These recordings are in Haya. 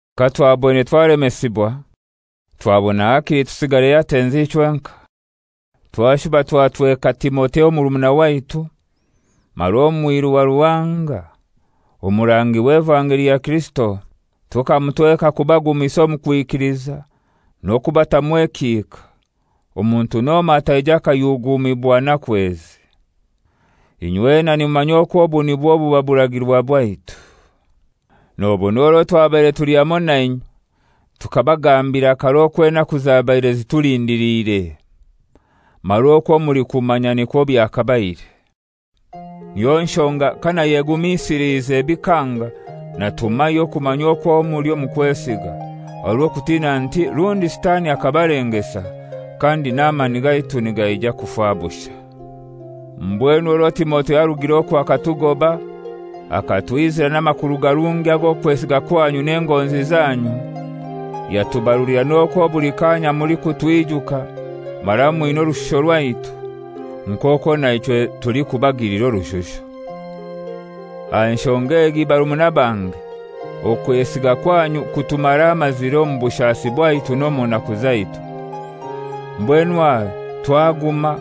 Katwaboine twalemesibwa twabona hakili tusigare Atenzi ichwenkai. Twashuba twatweka Timotheo murumuna waitu mara omwiru wa Ruhanga, omurangi w'evangeli ya Kirisito. Tukamutweka k'abagumisa omu kwikiliza n'okubatamu ekihika, omuntu n'omoi ataija akayugumibwa naku ezi. Inywena nimumanya okwo obu nibwo buba buragirwa bwaitu. Nobona orwo twabaire tuli hamoi nainywe tukabagambira karai okwo enaku zabaire zitulindiliire; mara okwo mulikumanya nikwo byakabaire. Niyo nshonga kanayegumisilize bikanga, natumayo kumanya okwo muli omu kwesiga, aha rw'okutina nti rundi Sitani akabalengesa, kandi n'amani gaitu nigaija kufa bushai. Mbwenu orwo Timotheo arugire okwo akatugoba, akatwizira n'amakuru garungi ag'okwesiga kwanyu n'engonzi zanyu, yatubarulira n'okwo buli kaanya mulikutwijuka mara mwina orushusho rwaitu, nk'okwo naichwe tulikubagilira orushusho. Aha nshonga egi barumuna bange, okwesiga kwanyu kutumaramazire omu bushasi bwaitu n'omu naku zaitu. Mbwenu aha twaguma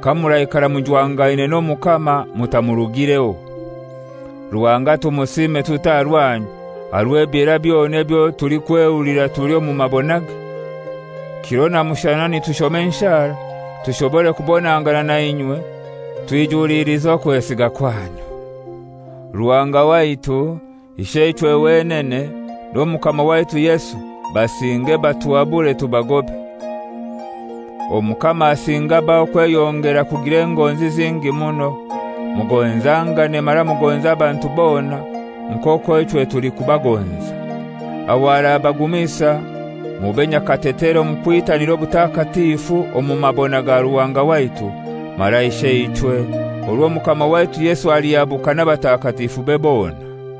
kamuraikara mujwangaine n'Omukama mutamurugireho. Ruhanga tumusiime tutai aha rwanyu aha rw'ebyera byona ebyo tulikwehulira tuli omu mabonage? Kiro na mushana nitushoma enshara tushobore kubonangana na inywe twijulilize okwesiga kwanyu. Ruhanga waitu, Isheichwe wenene, n'Omukama waitu Yesu basinge batuhabure tubagobe. Omukama asinge abahe okweyongera kugira engonzi zingi muno, mugonzangane mara mugonze abantu bona nk'okwo ichwe tulikubagonza. Aho arabagumisa mube nyakatetere omu kwitanira obutakatifu omu mabona ga Ruhanga waitu mara Isheichwe orwo Omukama waitu Yesu alihabuka n'abatakatifube bona.